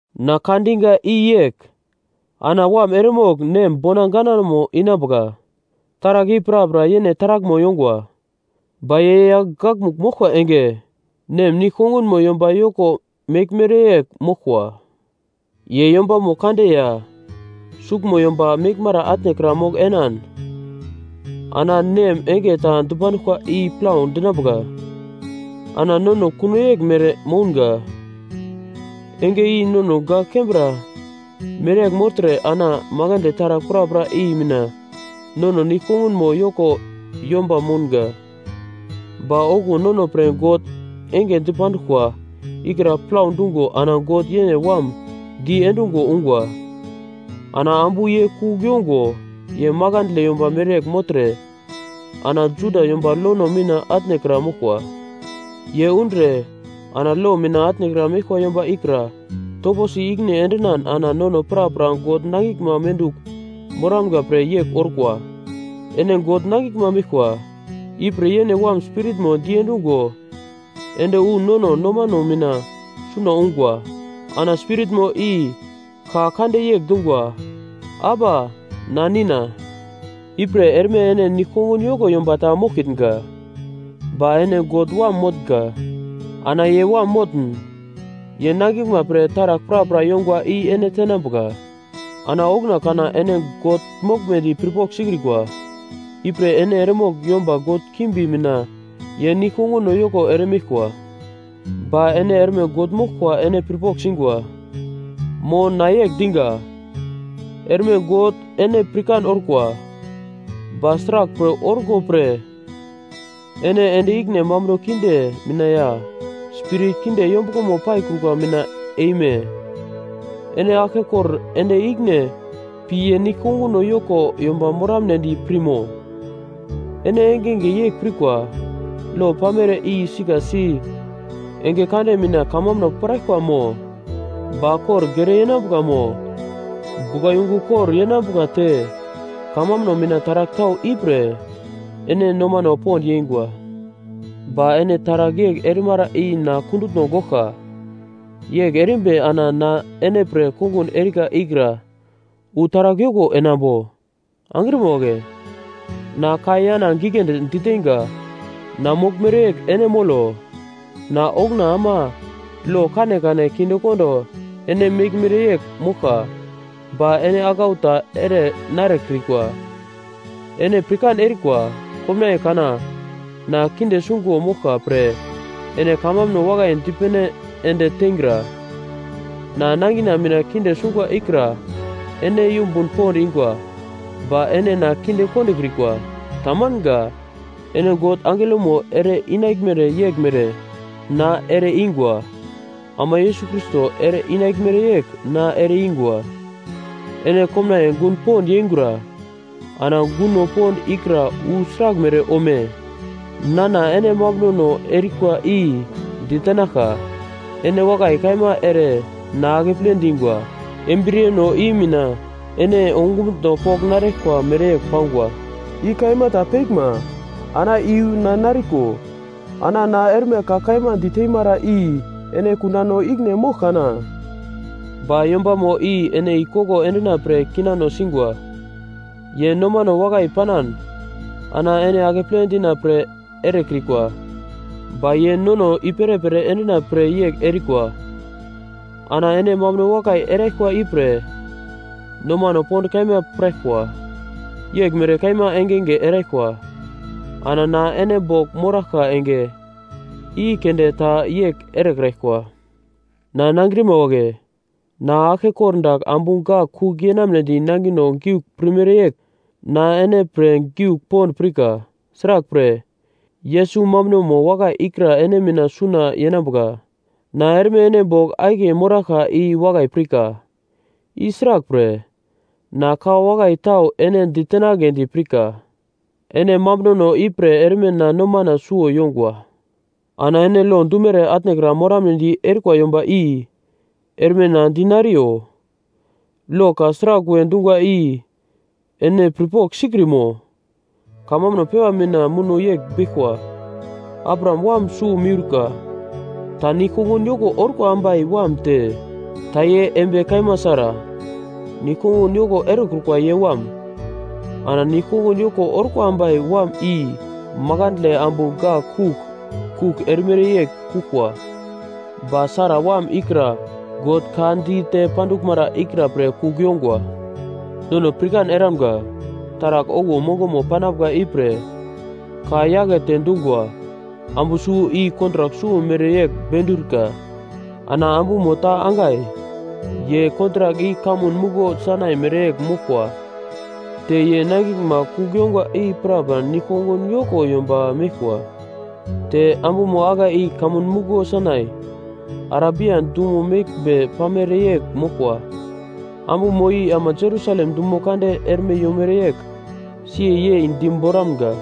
Na ka diga i yegl: Ana wam eremogl nem bona ganamo inambuka, taragl i prapra yene taraglmo yongwa. Ba ye yagl gakmugl moglkwa enge nem nigl-kongunmo yomba yoko meglmere yegl moglkwa. Ye yombamo kande ya suglmo yomba meglmara atnekra mogl enan ana nem enge ta dipanduglkwa i plau dinambuka. Ana nono kuno yeglmere mounga, enge i nono gak kembra mereyegl mogltre ana makandle taragl prapra i mina nono nigl-kongunmo yoko yomba mounga. Ba okuwo nono pre God enge dipanduglkwa ikra plau dungo ana God yene Wam diendungo ungwa. Ana ambu ye kugl yongo ye makandle yomba mereyegl mogltre ana Juda yomba lono mina atnekra moglkwa. Ye undre ana lo mina atnekra meglkwa yomba ikra toposi ikine endinan ana nono prapra God nangiglma mendugl moramga pre yegl orkwa. Ene God nangiglma meglkwa, ipre yene Wam Spiritmo diendungo ende wu nono nomano mina suna ungwa. Ana Spiritmo i ka kande yegl dungwa, “Aba na Nina.” Ipre erme ene nigl-kongun yoko yomba ta moglkitnga, ba ene God wam motnga. Ana ye wam motn, ye nangiglma pre taragl prapra yongwa i ene tenambuka. Ana okuna kana ene God moglmedi pirpogl sikrikwa, ipre ene eremogl yomba god kimbi mina ye nigl-konguno yoko ere meglkwa. Ba ene erme God moglkwa ene pirpogl singwa. Mo na yegl diga, erme God ene pirkan orkwa. Ba sraglpre orko pre ene ende ikine mambuno kinde mina ya spirit kinde yombuglomo paikrukwa mina eime? Ene aglkekor ende ikine pi ye nigl-konguno yoko yomba moramnedi pirmo? Ene engenge yegl pirkwa lo pamere i sika si enge kande mina kamambuno piraglkwa mo ba kor gere yenambuka mo buglayungu kor yenambuka te kamambuno mina taragl tau ipre ene nomano pond yeingwa. Ba ene taragl yegl erimara i na kundutno goglka. Yegl erimbi ana na ene pre kongun erika ikra wu sragl yoko enambo? Angrima wagle, na ka yana giglendi diteinga, na moglmere yegl ene molo. Na okuna ama lo kanekane kindekondo ene meglmere yegl moglka, ba ene aglau ta ere narekrikwa. Ene pirkan erikwa, komnaiye kana na kinde sungo moglka pre ene kamambuno wakai dipene ende teingra. Na nangina mina kinde sungwa ikra ene yumbun pond ingwa, ba ene na kinde kondokrikwa. Tamanga. Ene God angelomo ere-inaglmere yeglmere na ere-ingwa, ama Yesus Krais ere inaglmere yegl na ere ingwa. Ene komnaiye gun pond yeingura! Ana gunno pond ikra wu sraglmere ome? Nana ene mambunono erikwa i ditenaglka, ene wakai kaima ere na akeple dingwa, embriyeno i mina ene ongumutno pogl naraglkwa mereyegl pangwa, i kaima ta peglma, ana iyu na nariko. Ana na erme ka kaima diteimara i ene kundano ikine mogl kana? Ba yombamo i ene i koglo endina pre kinano singwa, ye nomano wakai panan ana ene akeple dina pre erekrikwa, ba ye nono i-perepere endina pre yegl erikwa. Ana ene mambuno wakai eraglkwa ipre nomano pond kaima piraglkwa, yeglmere kaima engenge eraglkwa, ana na ene bogl moraglka enge i keunde ta yegl erekraglkwa. Na nangrima wagle! Na aglke kordagl ambu gak kugl yenamnedi nangino giugl pirmere yegl, na ene pre giugl pond pirka. Sraglpre, Yesus mambunomo wakai ikra ene mina suna yenambuka. Na erme ene bogl akiye moraglka i wakai pirka, i sraglpre na ka wakai tau ene ditenagledi pirka, ene mambunono ipre erme na nomana suwo yongwa. Ana ene lo dumere atnekra moramnedi erikwa yomba i erme na dinariyo: Lo ka sragl we dungwa i ene pirpogl sikrimo? Kamambuno pepa mina muno yegl beglkwa: Abraham wam suwo miurka, ta nigl-kongun yoko orkwa ambai wam te ta ye embiye kaima Sara, nigl-kongun yoko erekrukwa ye wam. Ana nigl-kongun yoko orkwa ambai wam i makandle ambu gak kugl, kugl erimere yegl kuglkwa. Ba Sara wam ikra God ka dite panduglmara ikra pre kugl yongwa. Nono pirkan eramga, taragl okuwo mongomo panambuka ipre ka akete dungwa: Ambu suwo i kontrak suwo mere wu bendiruka. Ana ambumo ta Hagai ye kontrak i kamun muglo Sainai mereyegl moglkwa te ye nangiglma kugl yongwa i prapra nigl-kongun yoko yomba meglkwa. Te ambumo Hagai i kamun muglo Sainai, Arabia dumo meglmbe pamere yegl moglkwa. Ambumo i ama Jerusalem dumo kande erme yomere yegl si yei diboramga,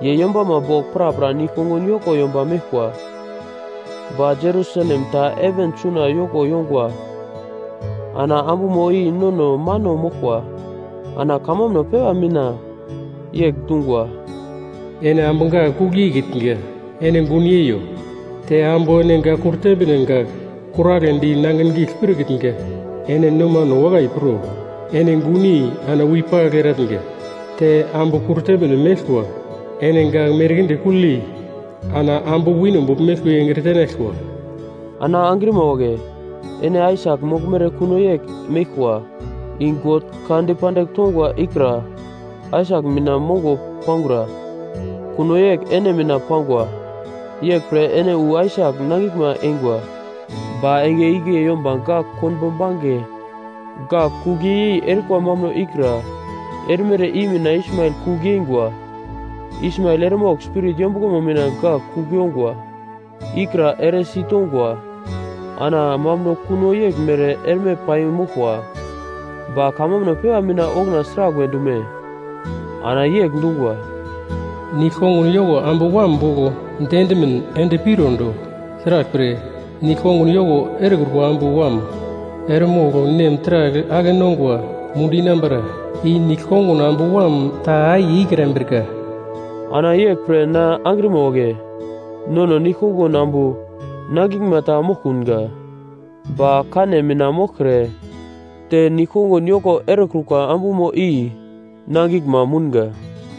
ye yombama bogl prapra nigl-kongun yoko yomba meglkwa. Ba Jerusalem ta heven suna yoko yongwa ana ambumo i nono mano moglkwa. Ana kamambuno pepa mina yegl dungwa: “Ene ambu gak kugl yeikitnga, ene gun yeiyo! Te ambu ene gak kurtemne gak kuragledi nangin giugl pirkitnga, ene nomano wakai pro. Ene gunyei ana wepagl eratnga! Te ambu kurtemne meglkwa ene gak merkinde kugl yei ana ambu wino bogl meglkwa i engre tenaglkwa.” Ana angrima wagle, ene Aisak moglmere kuno yegl meglkwa. I God ka dipandigl tongwa ikra Aisak mina mongo pangura, kuno yegl ene mina pangwa. Yeglpre ene wu Aisak nangiglma eingwa. Ba enge igle yomba gak konbo bange gak kugl yei-yei erikwa mambuno ikra erimere i mina Ismael kugl yeingwa. Ismael eremogl Spirit yombuglomo mina gak kugl yongwa ikra eresi tongwa, ana mambuno kuno yeglmere erme paimoglkwa. Ba kamambuno pepa mina okuna sragl we dume? Ana yegl dungwa, “Nigl-kongun yoko ambu wam bogl diendimin ende pirondo. Sraglpre, nigl-kongun yoko erekrukwa ambu wam eremogl nem taragl ake-nongwa mundu inambara i nigl-kongun ambu wam ta akiye ikrambrika.” Ana yeglpre na angrima wagle, nono nigl-kongun ambu nangiglma ta moglkunga, ba kane mina moglkre te nigl-kongun yoko erekrukwa ambu i nangiglma mounga.